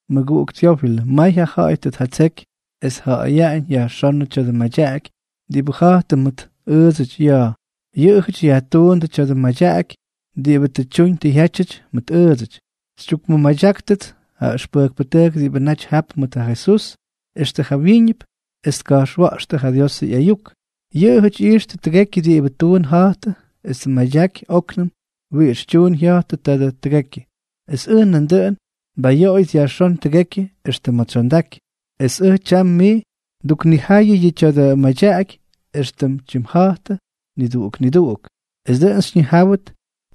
Mʉguꞌuk Tyófilʉ, may ja ja̱ꞌa̱y tʉ tjatseky es tjaja̱ꞌa̱yaꞌañ yajxónʉ tya̱dʉ madyaꞌaky diꞌibʉ ja̱jtʉ mʉt ʉʉdsʉty ya̱a̱. Yʉꞌʉjʉty yajtuundʉ tya̱dʉ madyaꞌaky diꞌibʉ tʉ tyuñ tʉ jyátyʉty mʉt ʉʉdsʉty. Xytyukmʉmadyáktʉts ja ʉxpʉjkpʉtʉjk diꞌibʉ naty jap mʉt ja Jesús extʉ jawyíñʉp es tka̱jxwa̱ꞌxtʉ ja Diosʉ ꞌyayuk. Yʉꞌʉjʉty ꞌyijxtʉ tʉgekyʉ diꞌibʉ tuun ja̱jtʉ es tmadyaky óknʉm wiꞌix tyuun jya̱jtʉ taadʉ tʉgekyʉ. Es ʉj nandʉꞌʉn, nbayoꞌoyʉts yajxón tʉgekyʉ extʉ ma̱ tsyondaky, es ʉj tyam mij nduknijayʉ yʉ tya̱dʉ madyaꞌaky éxtʉm tyimja̱jtʉ niduꞌuk niduꞌuk, es dʉꞌʉn xyñijáwʉt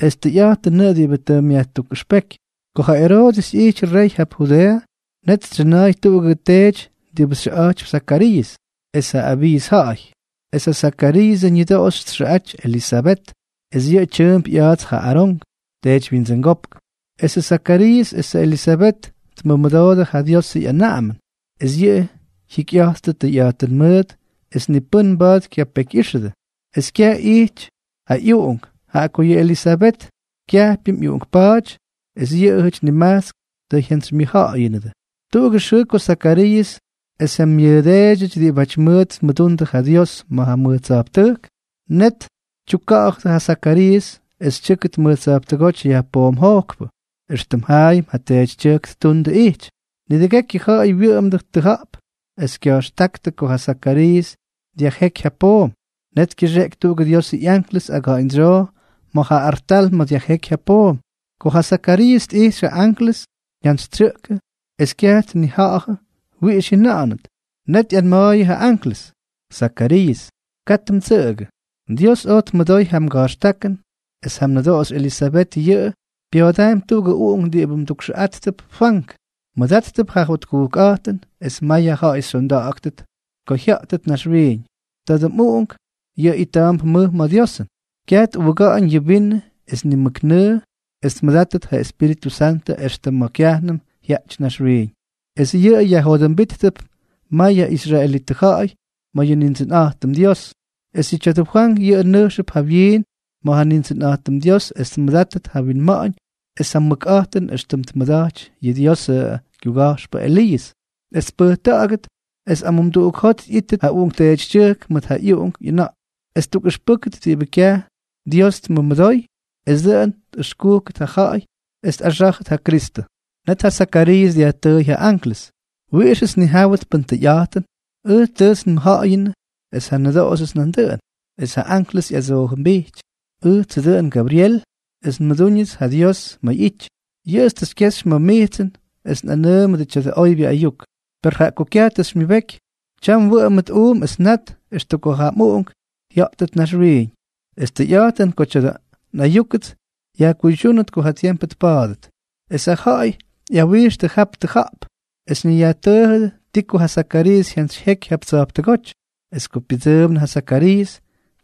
es tʉyꞌa̱jtʉnʉꞌʉ diꞌibʉ tʉ myajtukꞌʉxpéky. Ko ja Eroodʉs ꞌyijty rey jap Judeeʉ, net tsyʉna̱a̱y tuꞌugʉ teety diꞌibʉ xyʉꞌa̱jtypy Zakariiʉs es jaꞌa Abiiʉs ja̱ꞌa̱y. Es ja Zakariiʉsʉ ñʉdoꞌoxy txʉꞌa̱jty Elisabet, es yʉꞌʉ tyʉʉmp ꞌya̱a̱ts ja Arón, teedywyindsʉngópk. Esʉ Zakariiʉs esʉ Elisabet tmʉmʉdoodʉ ja Diosʉ ꞌyanaꞌamʉn. Es yʉꞌʉ jikyꞌa̱jttʉp tʉyꞌa̱jtʉn mʉʉt es ni pʉ́n mba̱a̱t kyapekyꞌíxʉdʉ. Es kyaj ijty ja ꞌyuꞌunk, jaꞌa ko yʉ Elisabet kyajpyʉm ꞌyuꞌunkpa̱a̱ty es yʉꞌʉjʉty nimajtsk tʉ jyantsymyʉjja̱ꞌa̱yʉnʉ. Tuꞌugʉ xʉʉ ko Zakariiʉs es ja myʉʉdeedyʉty diꞌibáty mʉʉt tmʉdundʉ ja Dios ma̱ mʉj tsa̱jptʉjk, net tyukka̱ꞌa̱jʉ ja Zakariiʉs es tyʉ́kʉt mʉj tsa̱jptʉgóty yajpoomjojkpʉ, éxtʉm jaayʉm ja teetytyʉjk ttundʉ tʉ ꞌyity. Nidʉgekyʉ ja̱ꞌa̱y wyʉꞌʉmdʉ tʉja̱ꞌp es kya̱jxtáktʉ ko ja Zakariiʉs dyajjéky ja poom. Net kyʉxeꞌky tuꞌugʉ Diosʉ ꞌyanklʉs aga̱ꞌa̱ñdsyoo ma̱ ja artal ma̱ dyajjéky ja poom. Ko ja Zakariiʉs tꞌijxy ja anklʉs, jyantsytsyʉꞌkʉ es kyaj tnija̱ꞌa̱jʉ wiꞌix jyʉna̱ꞌa̱nʉt. Net ꞌyanma̱a̱yʉ ja anklʉs: —Zakariiʉs, katʉ mdsʉꞌʉgʉ. Dios oj tmʉdoy ja mga̱jxtákʉn, es ja mnʉdoꞌoxy Elisabet yʉꞌʉ pya̱a̱daampy tuꞌugʉ uꞌunk diꞌibʉ mdukxʉꞌáttʉp Fwank. Mmʉdáttʉp ja jotkujkꞌa̱jtʉn, es may ja ja̱ꞌa̱y xyonda̱ꞌa̱gʉt ko jya̱ꞌtʉt naxwiiñ. Tadʉ mꞌuꞌunk yʉꞌʉ ita̱a̱mp mʉj ma̱ Diosʉn. Kyaj tꞌuuga̱ꞌa̱ñ yʉ vinʉ es ni mʉk nʉʉ es tmʉdátʉt ja Espíritʉ Santʉ extʉ ma̱ kyajnʉm jyaꞌty naxwiiñ. Es yʉꞌʉ yajjodʉmbíttʉp mayʉ israelitʉ ja̱ꞌa̱y ma̱ yʉ Nindsʉnꞌa̱jtʉm Dios. Es ja tya̱dʉ Fwank yʉꞌʉ nʉjxʉp jawyiin ma̱ ja Nindsʉnꞌa̱jtʉm es tmʉdátʉt ja winma̱ꞌa̱ñ es ja mʉkꞌa̱jtʉn éxtʉm tmʉda̱jty yʉ Diosʉ kyuga̱jxpʉ Eliiʉs, es tpʉjta̱ꞌa̱gʉt es amumduꞌuk jot ꞌyíttʉt ja uꞌunkteetytyʉjk mʉt ja ꞌyuꞌunk ꞌyʉna̱ꞌk es ttukꞌʉxpʉ́kʉt diꞌibʉ kyaj Dios tmʉmʉdoy, es dʉꞌʉn tꞌʉxkúkʉt ja ja̱ꞌa̱y es tꞌaxá̱jʉt ja Kristʉ. Net ja Zakariiʉs dyajtʉʉy ja anklʉs: —¿Wiꞌixʉts nnijáwʉt pʉn tʉyꞌa̱jtʉn? Ʉj tʉts nmʉjja̱ꞌa̱yʉnʉ es ja nnʉdoꞌoxyʉts nandʉꞌʉn. Es ja anklʉs ꞌyadsoojʉmbijty: —Ʉjtsʉ dʉꞌʉn Gabryel es nmʉdúñʉts ja Dios ma̱ ꞌyity. Yʉꞌʉts tʉ xykyexy ma̱ mijtsʉn es nꞌanʉʉmʉdʉ tya̱dʉ oybyʉ ayuk. Per jaꞌa ko kyaj xymyʉbeky, tyam mwʉꞌʉmʉt uum es nat extʉ ko ja mꞌuꞌunk jya̱ꞌtʉt naxwiiñ. Es tʉyꞌa̱jtʉn ko tya̱dʉ nꞌayúkʉts yajkuydyúnʉt ko ja tiempʉ tpa̱a̱dʉt. Es ja ja̱ꞌa̱y ꞌyawijxtʉ jap tʉja̱ꞌp es ñayyajtʉʉjʉdʉ ti ko ja Zakariiʉs jyantsyjyeky jap tsa̱jptʉgóty. Es ko pyʉdsʉʉmnʉ ja Zakariiʉs,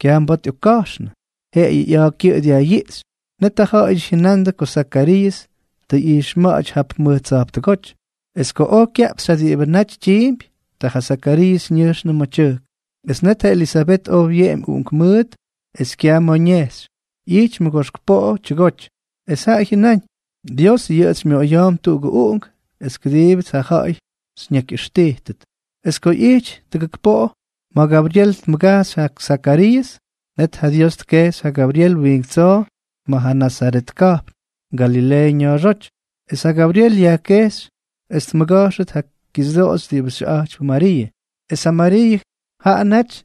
kyaj mba̱a̱t ꞌyokka̱jxnʉ, jeꞌeyʉ ꞌya̱a̱ kyʉꞌʉ dyajꞌyiꞌxy. Net ja ja̱ꞌa̱yʉty jyʉnandʉ ko Zakariiʉs tʉ ꞌyijxma̱ꞌa̱ty jap mʉj tsa̱jptʉgóty. Es ko oj kyaꞌpxy ja diꞌibʉ naty tyiimpy, ta ja Zakariiʉs ñʉjxnʉ ma̱ tyʉjk. Es net ja Elisabet oj wyeꞌemy uꞌunkmʉʉt es kyaj ma̱ ñejxy, ꞌyijty mʉgoxk poꞌo tyʉgoty. Es jaꞌa jyʉnáñ: “Dios yʉꞌʉts xymyoꞌoya̱a̱mp yʉ uꞌunk es kʉdiibʉts ja ja̱ꞌa̱y xyñakꞌʉxtíjʉt.” Es ko ꞌyijty tʉdujk poꞌo ma̱ Gabryel tmʉgajxy ja Zakariiʉs, net ja Dios tkejxy ja Gabryel wiink tsoo ma̱ ja Nazaret ka̱jpn, Galileeʉ ña̱a̱xóty. Es ja Gabryel yajkejxy es tmʉga̱jxʉt ja kixyʉdoꞌoxy diꞌibʉ xyʉꞌa̱jtypy Mariiʉ. Es ja Mariiʉ, jaꞌa naty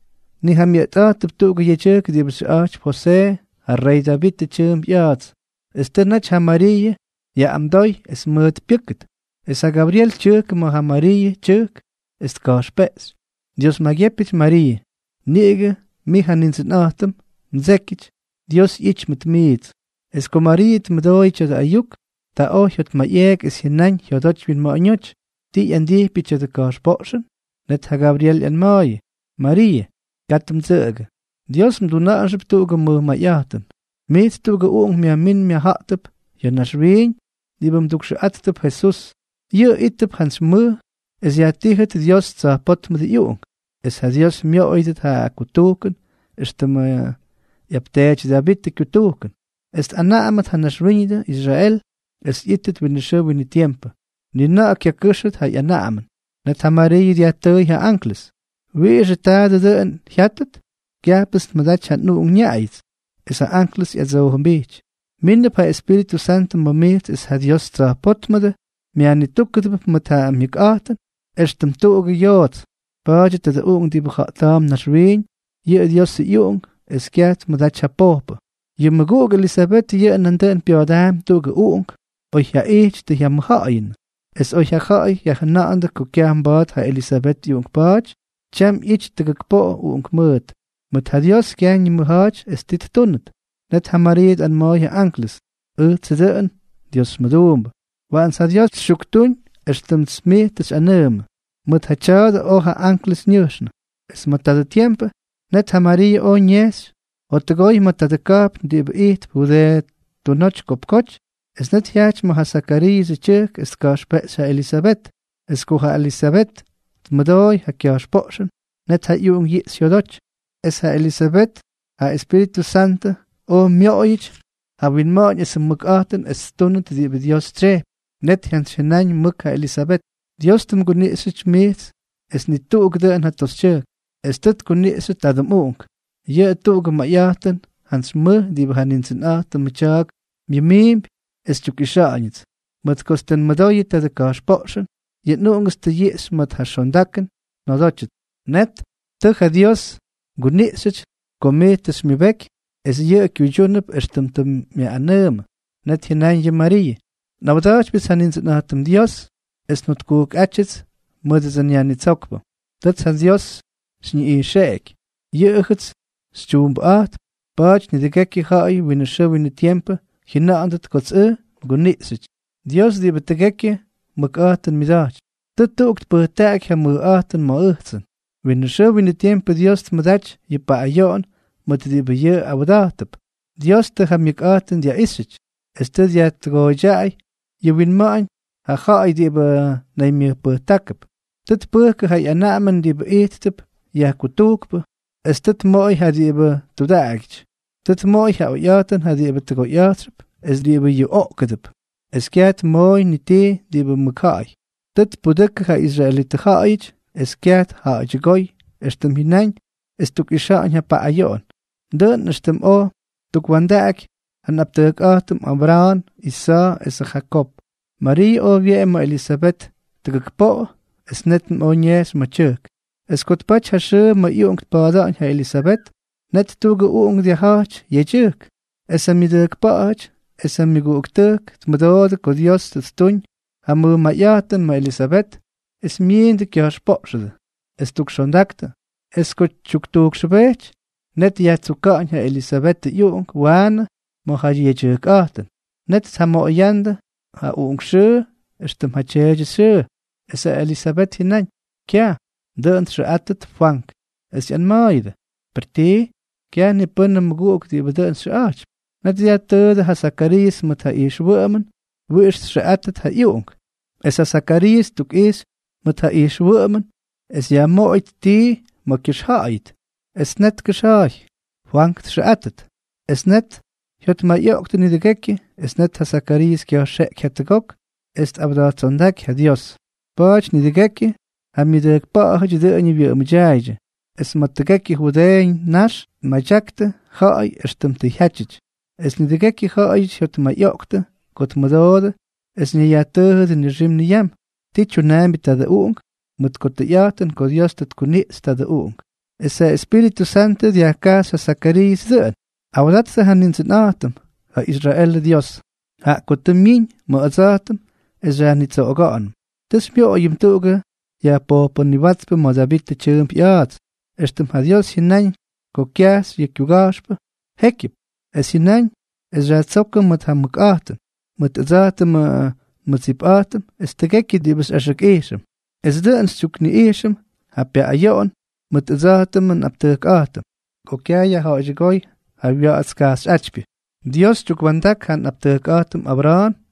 nijamyʉꞌtꞌa̱jtʉp tuꞌugʉ yedyʉjk diꞌibʉ xyʉꞌa̱jtypy Josee, ja rey Davitʉ tyʉʉmp ꞌya̱a̱ts, es tʉ naty ja Mariiʉ yaꞌꞌamdoy es mʉʉt pyʉ́kʉt. Es ja Gabryel tyʉjkʉ ma̱ ja Mariiʉ tyʉjk, es tka̱jxpeꞌxy: —Dios maygyépyʉty Mariiʉ. Niꞌigʉ mij ja Nindsʉnꞌa̱jtʉm mdsékyʉty, Dios ꞌyity mʉt mijts. Es ko Mariiʉ tmʉdooyʉ tya̱dʉ ayuk, ta oj jyotmayꞌeeky es jyʉnaꞌañ jyodoty wyinma̱ꞌa̱ñóty: “¿Ti ꞌyandijpyʉ tya̱dʉ ka̱jxpoꞌxʉn?” Net ja Gabryel ꞌyanma̱a̱yʉ: —Mariiʉ, katʉ mdsʉꞌʉgʉ. Dios mduna̱ꞌa̱nxʉp tuꞌugʉ mʉj mayꞌa̱jtʉn. Mijts tuꞌugʉ uꞌunk myajmín myajja̱ꞌtʉp ya̱ naxwiiñ diꞌibʉ mdukxʉꞌátʉp Jesús. Yʉꞌʉ ítʉp jantsy mʉj es yajtíjʉt Dios Tsa̱jpótmʉdʉ ꞌyUꞌunk, es ja Dios myoꞌoyʉdʉt ja kutujkʉn éxtʉmʉ ꞌyapteety Davitʉ kyutujkʉn, es tꞌanaꞌamʉt ma̱ naxwíñʉdʉ Israel es ꞌyítʉt winʉ xʉʉ winʉ tiempʉ. Ni na̱ꞌa̱ kyakʉ́xʉt yʉ ꞌyanaꞌamʉn. Net ja Mariiʉ dyajtʉʉy ja anklʉs: —¿Wiꞌixʉ taadʉ dʉꞌʉn jyátʉt? Kyajpʉts nmʉdaty ja nꞌuꞌunk nñaꞌayʉts. Es ja anklʉs ꞌyadsoojʉmbijty: —Mínʉp ja Espíritʉ Santʉ ma̱ mijts es ja Dios Tsa̱jpótmʉdʉ myajnitúkʉdʉp mʉt ja myʉkꞌa̱jtʉn éxtʉm tuꞌugʉ yoots. Pa̱a̱dyʉ tadʉ uꞌunk diꞌibʉ ja̱ꞌta̱a̱mp naxwiiñ, yʉꞌʉ Diosʉ ꞌyUꞌunk es kyaj tmʉdaty ja pojpʉ. Yʉ mmʉguꞌuk Elisabet yʉꞌʉ nandʉꞌʉn pya̱a̱daampy tuꞌugʉ uꞌunk, oyjyaꞌijty tʉ jyamʉjja̱ꞌa̱yʉnʉ. Es oy ja ja̱ꞌa̱y jyajʉna̱ꞌa̱ndʉ ko kyaj mba̱a̱t ja Elisabet ꞌyuꞌunkpa̱a̱ty, tyam ꞌyity tʉdujk poꞌo uꞌunkmʉʉt. Mʉt ja Dios kyaj ñimʉja̱a̱ty es ti ttúnʉt. Net ja Mariiʉ tꞌanma̱a̱y ja anklʉs: —Ʉjtsʉ dʉꞌʉn Dios mʉduumbʉ. Waꞌants ja Dios xytyuktúñ éxtʉmts mij tʉ xyꞌanʉʉmʉ. Mʉt ja tya̱a̱dʉ oj ja anklʉs ñʉjxnʉ. Es ma̱ tadʉ tiempʉ, net ja Mariiʉ oj ñejxy jottʉgoy ma̱ tuꞌugʉ ka̱jpn diꞌibʉ ijtp Judeeʉ tunoty kopkoty. Es net jyajty ma̱ ja Zakariiʉsʉ tyʉjk es tka̱jxpeꞌxy ja Elisabet. Es ko ja Elisabet tmʉdooy ja kya̱jxpoꞌxʉn, net ja ꞌyuꞌunk yiꞌxy jyodoty. Es ja Elisabet ja Espíritʉ Santʉ oj myoꞌoyʉty ja winma̱ꞌa̱ñ esʉ mʉkꞌa̱jtʉn es ttúnʉt diꞌibʉ Dios tsyejpy. Net jyantsyjyʉnáñ mʉk ja Elisabet: —Dios tʉ mguniꞌxyʉty mijts es ni tuꞌuk dʉꞌʉn ja toxytyʉjk, es tʉ tkuniꞌxyʉ tadʉ mꞌUꞌunk. ¡Yʉꞌʉ tuꞌugʉ mayꞌa̱jtʉn jantsy mʉj diꞌibʉ ja Nindsʉnꞌa̱jtʉmʉ tya̱a̱k myʉmiimpy es xykyuꞌixa̱ꞌa̱ñʉts! Mʉt kots tʉ nmʉdoyʉ tadʉ mga̱jxpoꞌxʉn, yʉ nꞌuꞌungʉts tʉ yiꞌxy mʉt ja xondakʉn njodótyʉts. Tʉ ja Dios mguniꞌxyʉty ko mij tʉ xymyʉbeky, es yʉꞌʉ kyuydyúnʉp éxtʉm tʉ myaꞌꞌanʉʉmʉ. Net jyʉnáñ yʉ Mariiʉ: Nꞌawda̱jtypyʉts ja Nindsʉnꞌa̱jtʉm Dios es njotkujkꞌátyʉts mʉdʉdsʉ nYajnitsókpʉ. Tʉts ja Diósʉts xyñiꞌijxeꞌeky, yʉꞌʉjʉts xytyuumbʉꞌa̱jtp, pa̱a̱ty nidʉgekyʉ ja̱ꞌa̱y winʉ xʉʉ winʉ tiempʉ jyʉna̱ꞌa̱ndʉt kots ʉj nguniꞌxyʉty. Dios diꞌibʉ tʉgekyʉ mʉkꞌa̱jtʉn myʉda̱jtypy, tʉ tuꞌuk tpʉjtaꞌaky ja mʉjꞌa̱jtʉn ma̱ ʉjtsʉn. Winʉ xʉʉ winʉ tiempʉ Dios tmʉdaty yʉ paꞌꞌayoꞌon mʉt diꞌibʉ yʉꞌʉ awda̱jtʉdʉp. Dios tʉ ja myʉkꞌa̱jtʉn dyaꞌíxyʉty, es tʉ dyajtʉgooydyaꞌay yʉ wyinma̱ꞌa̱ñ ja ja̱ꞌa̱y diꞌibʉ naymyʉjpʉjtákʉp. Tʉ tpʉjkʉ ja ꞌyanaꞌamʉn diꞌibʉ ijttʉp yajkutujkpʉ, es tʉ tmoꞌoy ja diꞌibʉ tudaꞌagyʉty. Tʉ tmoꞌoy ja oyꞌa̱jtʉn ja diꞌibʉ tʉgoyꞌa̱jtxʉp es diꞌibʉ yuꞌoꞌkʉdʉp, es kyaj tmooy ni tii diꞌibʉ mʉkja̱ꞌa̱y. Tʉ tpudʉkʉ ja israelitʉ ja̱ꞌa̱yʉty, es kyaj tja̱ꞌa̱ydyʉgóy éxtʉm jyʉnáñ es ttukꞌixa̱ꞌa̱ñ ja paꞌꞌayoꞌon, dʉꞌʉn éxtʉm oj ttukwa̱ndaky ja nꞌaptʉjkꞌa̱jtʉm Abra̱a̱n, Isa̱a̱ esʉ Jakoob. Mariiʉ oj wyeꞌemy ma̱ Elisabet tʉgʉk poꞌo, es nétnʉm oj ñejxy ma̱ ja tyʉjk. Es ko tpaty ja xʉʉ ma̱ ꞌyuꞌunk tpa̱a̱da̱ꞌa̱ñ ja Elisabet, net tuꞌugʉ uꞌunk dyajja̱jty yedyʉjk. Es ja myʉdʉjkpa̱ꞌa̱jʉty es ja myʉguꞌuktʉjk tmʉdoodʉ ko Dios tʉ ttuñ ja mʉj mayꞌa̱jtʉn ma̱ Elisabet, es myiindʉ kya̱jxpoꞌxʉdʉ es ttukxondaktʉ. Es ko tyuktujkxʉbejty, net yajtsuka̱ꞌa̱ñ ja Elisabetʉ ꞌyuꞌunk waanʉ ma̱ ja yedyʉjkꞌa̱jtʉn. Net tjamoꞌoyándʉ ja uꞌunk xʉʉ éxtʉm ja tyeety Zakariiʉs xyʉʉ. Es ja Elisabet jyʉnáñ: —Kyaj. Dʉꞌʉn txʉꞌátʉt Fwank. Es ꞌyanma̱a̱yʉdʉ: —¿Per tii? Kyaj ni pʉ́nʉ mmʉguꞌuk diꞌibʉ dʉꞌʉn xyʉꞌa̱jtypy. Net dyajtʉʉdʉ ja Zakariiʉs mʉt ja ijxwʉꞌʉmʉn wiꞌix txʉꞌátʉt ja ꞌyuꞌunk. Es ja Zakariiʉs ttukꞌixy mʉt ja ijxwʉꞌʉmʉn es yajmoꞌoyʉt tii ma̱ kyʉxja̱ꞌa̱yʉt. Es net tkʉxja̱a̱y: “Fwank txʉꞌátʉt.” Es net jyotmayꞌoꞌktʉ nidʉgekyʉ. Es net ja Zakariiʉs kya̱jxeꞌky jatʉgok es tꞌawda̱jttsondáky ja Dios. Pa̱a̱ty nidʉgekyʉ ja myʉdʉjkpa̱ꞌa̱jʉty dʉꞌʉñʉ wyʉꞌʉmʉdyaaydyʉ, es ma̱ tʉgekyʉ Judeeʉ ñax tmadyaktʉ ja̱ꞌa̱y éxtʉm tʉ jyátyʉty. Es nidʉgekyʉ ja̱ꞌa̱yʉty jyotmayꞌoꞌktʉ ko tmʉdoodʉ es ñayyajtʉʉjʉdʉ nixim niyam: “¿Ti tyunaambyʉ tadʉ uꞌunk?”, mʉt ko tʉyꞌa̱jtʉn ko Dios tʉ tkuniꞌxy tadʉ uꞌunk. Es ja Espíritʉ Santʉ dyajkajxy ja Zakariiʉs dʉꞌʉn: Awdattʉ ja Nindsʉnꞌa̱jtʉm, ja Israelʉ Dyios, jaꞌa ko tʉ myiñ ma̱ ʉdsa̱jtʉm es xyajnitsoꞌoga̱ꞌa̱nʉm. Tʉ xymyoꞌoyʉm tuꞌugʉ yajpojpʉniwátspʉ ma̱ Davitʉ tyʉʉmp ꞌya̱a̱ts, éxtʉm ja Dios jyʉnáñ ko kyajxy ja kyuga̱jxpʉ jékyʉp. Es jyʉnáñ es xyajtsókʉm mʉt ja mʉkꞌa̱jtʉn mʉt ʉdsa̱jtʉmʉ nmʉdsipꞌa̱jtʉm es tʉgekyʉ diꞌibʉ xyꞌaxʉkꞌijxʉm. Es dʉꞌʉn xytyukꞌijxʉm ja pyaꞌꞌayoꞌon mʉt ʉdsa̱jtʉmʉ nꞌaptʉjkꞌa̱jtʉm, ko kyaj yajja̱ꞌa̱ydyʉgóy ja wya̱ꞌa̱ts kajxyꞌátypyʉ. Dios tyukwa̱ndak ja nꞌaptʉjkꞌa̱jtʉm Abra̱a̱n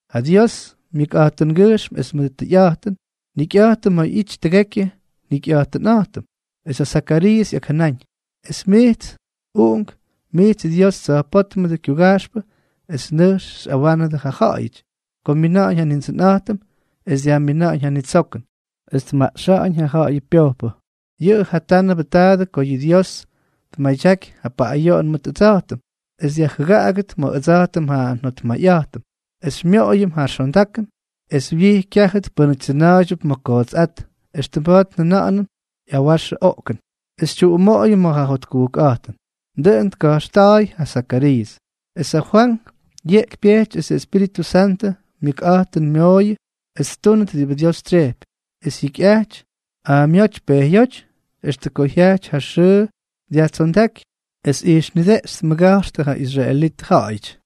ja Dios myʉjꞌa̱jtʉngyʉjxm es mʉdʉ tʉyꞌa̱jtʉn, njikyꞌa̱jtʉm ma̱ ꞌyity tʉgekyʉ njikyꞌa̱jtʉnꞌa̱jtʉm. Es ja Zakariiʉs ꞌyakjʉnáñ: Es mijts, uꞌunk, mijts Dios Tsa̱jpótmʉdʉ kyuga̱jxpʉ es nʉjx xyꞌawánʉdʉ ja ja̱ꞌa̱yʉty ko myina̱ꞌa̱ñ ja Nindsʉnꞌa̱jtʉm, es dyajmina̱ꞌa̱ñ ja nitsokʉn, es tmaꞌxa̱ꞌa̱ñ ja ja̱ꞌa̱yʉ pyojpʉ. Yʉꞌʉ jatánʉbʉ taadʉ ko yʉ Dios tmʉdaty ja paꞌꞌayoꞌon mʉt ʉdsa̱jtʉm es dyajjʉgaꞌagʉt ma̱ ʉdsa̱jtʉm ja njotmayꞌa̱jtʉnꞌa̱jtʉm, es xymyoꞌoyʉm ja xondakʉn, es wyij kyajtʉt pʉ́nʉty tsʉna̱a̱ydyʉp ma̱ kootsꞌát, éxtʉm mba̱a̱t njʉna̱ꞌa̱nʉm ꞌyawaxʉ oꞌkʉn, es xytyuꞌumoꞌoyʉm ma̱ ja jotkujkꞌa̱jtʉn. Dʉꞌʉn tka̱jxta̱a̱y ja Zakariiʉs. Es ja Fwank yeꞌky pyejty esʉ Espíritʉ Santʉ myʉkꞌa̱jtʉnmooyʉ es ttúnʉt diꞌibʉ Dios tsyejpy, es jyikyꞌajty aamyóty pejyóty extʉ ko jyajty ja xʉʉ es dyajtsondáky es ijxy nideꞌxy tmʉga̱jxtʉ ja israelitʉ ja̱ꞌa̱yʉty.